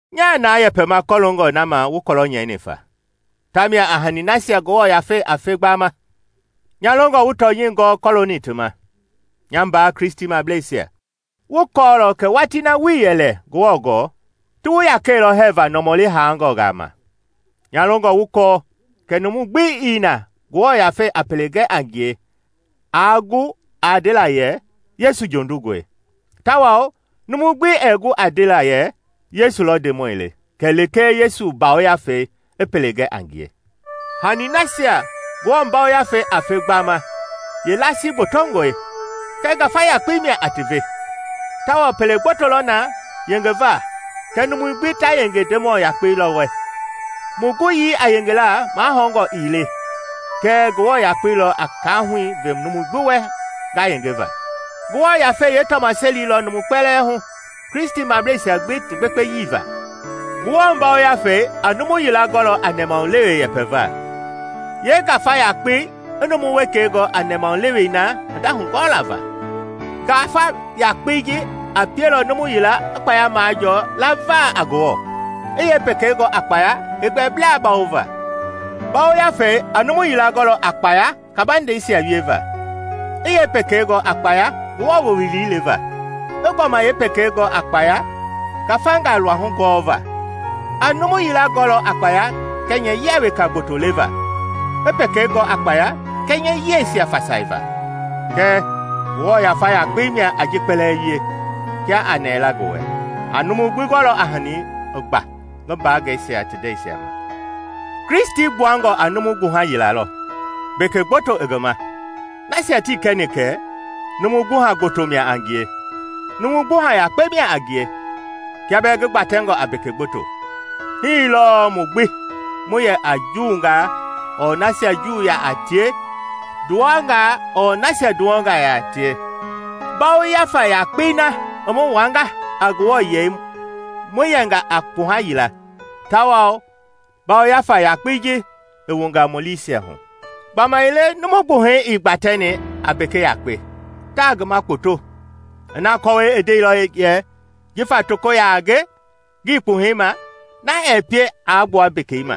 Nyaa na yɛpɛma kɔloongɔ na ma wu kɔlɔ nyɛini fa, tamia a hani nasia Ngewɔ Yafei a fe gbama. Nya longɔ wu tɔnyɛi gɔɔ kɔlooni ti ma, nya mbaa Kristimableisia. Wu kɔɔlɔ kɛ watii na wuii yɛ lɛ Ngewɔ gɔɔ, ti wu yakɛilɔ hɛɛva nɔmɔli haangɔngaa ma. Nya longɔ wu kɔɔ kɛ numu gbi ii na Ngewɔ Yafei a pele gɛ a ngie aa gu a ndela yɛ, “Yesu jondungɔe!” Tawao numu gbi ɛɛ gu a ndela yɛ “Yesu lɔ Ndemɔi le” kɛlee Ngewɔ Yafei i pele gɛ a ngie. Hani nasia Ngewɔ Yafei a fe gbama yeelasii gbotongɔe, kɛɛ Ngafa yakpei mia a ti ve. Tawao pele gboto lɔ na yengeva kɛɛ numui gbi ta yenge Ndemɔ yakpei lɔ wɛ. Mu guyii a yengela mahɔngɔ ii le kɛɛ Ngewɔ yakpei lɔ a kaahui ve numu gbi wɛ nga yenge va. Ngewɔ Yafei yeetɔmaseli lɔ numu kpɛlɛɛ hu, Kristimableisia gbi ti gbekpeyei va. Ngewɔ Yafei a numu yila gɔlɔ a nɛmahulewe yɛpɛva, yee-Ngafa yakpei i numu wekei gɔ a nɛmahulewe na hinda-hugɔɔla va. Ngafa yakpei ji a pielɔ numu yila i kpaya majɔɔ lava a Ngewɔ, i yeepekei gɔ a kpaya heegbɛblaa bawova. Ngafei a numu yila gɔlɔ a kpaya kabandeisia wieva; i yeepekei gɔ a kpaya Ngewɔ wowili leva; i gbɔma yeepekei gɔ a kpaya ngafangaa luahu gɔva. A numu yila gɔlɔ a kpaya kɛnyɛyia weka gboto leva, i pekei gɔ a kpaya kɛnyɛyiɛisia fasaiva. Kɛɛ Ngewɔ Yafa yakpei mia a ji kpɛlɛɛ ve; kia a nɛɛ la ngi wɛ, a numu gbi gɔlɔ a hani i gba ngi mbaangɛisia ti ndɛisia ma. Kristi gbuangɔ a numu gbuha yila lɔ, mbeke gboto i ngi ma; nasia tii kɛni kɛ, numu gbuha gboto mia a ngie, numu gbuha yakpe mia a ngie, kia bɛɛ ngi gbatɛngɔ a mbeke gboto. Hii lɔɔ mu gbi, mu yɛ a Juungaa ɔɔ nasia Juu yaa tie, nduwɔngaa ɔɔ nasia nduwɔ yaa tie, Ngafa yakpei na i mu wuanga a Ngewɔ yei mu yenga a kpuha yila, tawao Ngafa yakpei ji i wunga mu liisia hu. Gbamaile numu gbuhɛi ii gbatɛni a mbeke yakpe, taa ngi ma kpoto. Ina kɔwɔi i ndeilɔ yɛ, “Jifa toko yaa a nge, ngii kpuhɛi ma,” na ɛɛ pie aa gbua mbeke ma.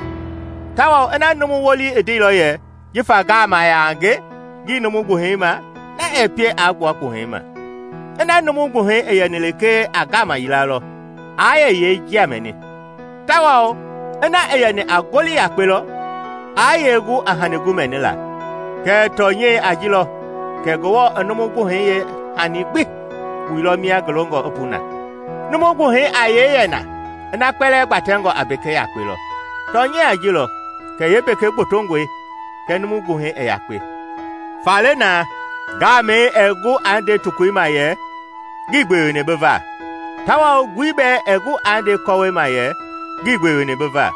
Tawao ina numu wolii i ndeilɔ yɛ, “Jifa ngaama yaa a nge, ngii numu gbuhɛi ma,” na ɛɛ pie aa gbua kpuhɛi ma. Ina numu gbuhɛi gbi i yɛni lekee a ngaama yila lɔ, aa yee njia mɛni? Tawao kiaa i yɛni a ngoli yakpe lɔ, aa yee gu a hani gu mɛnila? Kɛɛ tɔnyɛi a ji lɔ kɛ Ngewɔ i numu gbuhɛi yeehani gbi wuilɔ mia ngi longɔ i pu na. Numu gbuhɛi a yee yɛ na ina kpɛlɛɛ gbatɛngɔ a mbeke yakpe lɔ? Tɔnyɛi a ji lɔ kɛ yeembeke gbotongɔe kɛɛ numu gbuhɛi i yakpe. Faale na, ngaamɛi ɛɛ gu aa nde tokoi ma yɛ, “Ngii gbeweni bi va!” Tawao ngui bɛɛ ɛɛ gu aa nde kɔwɔi ma yɛ, “Ngii gbeweni bi va.”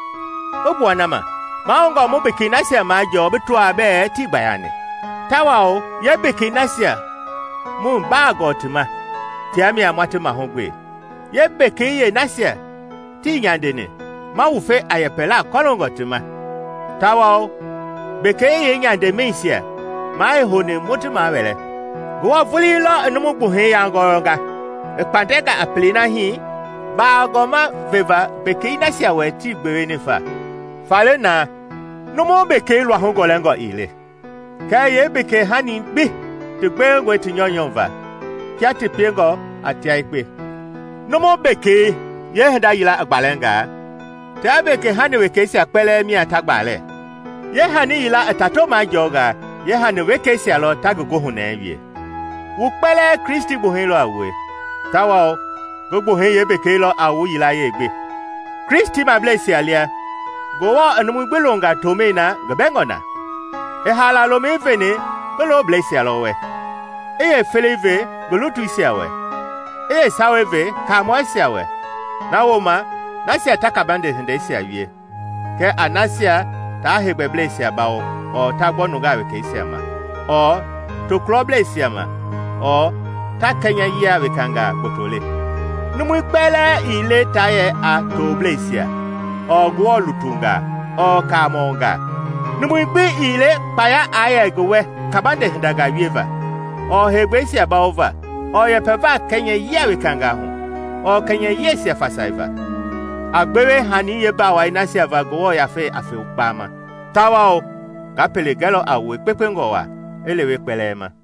I gbua na ma, mahoungɔ mu mbekei nasia majɔɔ bi tɔaa bɛɛ tii gbayani; tawao yeembekei nasia mu baa gɔɔ ti ma, tia mia ma ti mahugbe, yeembekei yeenasia tii nyandeni ma wufe a yɛpɛlaa kɔloongɔ, tawao mu mbeke yeenyandemɛisia maa i houni mu ti mahuwɛɛ. Ngewɔ vulii lɔ i numu gbuhɛi yangɔyɔnga i kpatɛnga a pelei na hii bagɔma veva mbeke nasia wɛ tii gbeweni fa. Faale na, numu mbekei luahu gɔlɛngɔ ii le, kɛɛ yeembekei-hanisia gbi ti gbewengɔe ti nyɔunyɔ va kia ti piengɔ a tia yekpe. Numu mbekei yeehinda yila i gbalɛngaa, tia mbekei hani wekeisia kpɛlɛɛ mia ta gbalɛ; yeehani yila i tato majɔɔngaa, yeehani-hani wekeisia lɔ ta ngi goohunɛɛi wie. Wu kpɛlɛɛ Kristi gbuhɛi lɔ a wue, tawao ngi gbuhɛi yeembekei lɔ a wu yilayee gbi. Kristimableisia lia Ngewɔ i numui gbi longa tomɛi na ngi bɛngɔ na. I haala lomɛi veni ngi loblɛisia lɔ wɛ, i yeefelei ve ngi lutuisia we, i yeesawei ve kaamɔisia wɛ; na wooma nasia ta kabande hindeisia wie, kɛɛ a nasia ta heegbɛisia bawo ɔɔ ta gbɔ nungaa wekeisia ma ɔɔ tokulɔbleisia ma ɔɔ ta kɛnyɛyia wekangaa gboto le. Numui kpɛlɛɛ ii le taa yɛ a toblɛisia, ɔɔ Ngewɔ lutungaa ɔɔ kaamɔngaa. Numui gbi ii le kpaya aa yɛ ngi wɛ kabande hindangaa wieva ɔɔ heegbɛisia bawova ɔɔ yɛpɛva kɛnyɛyia wekangaa hu ɔɔ yeekɛnyɛyiɛisia fasaiva. A gbewe hani yeebawai nasia va Ngewɔ Yafei a fe gbama. Tawao nga pele gɛlɔ a wue kpekpengɔ waa i lewe kpɛlɛɛ ma.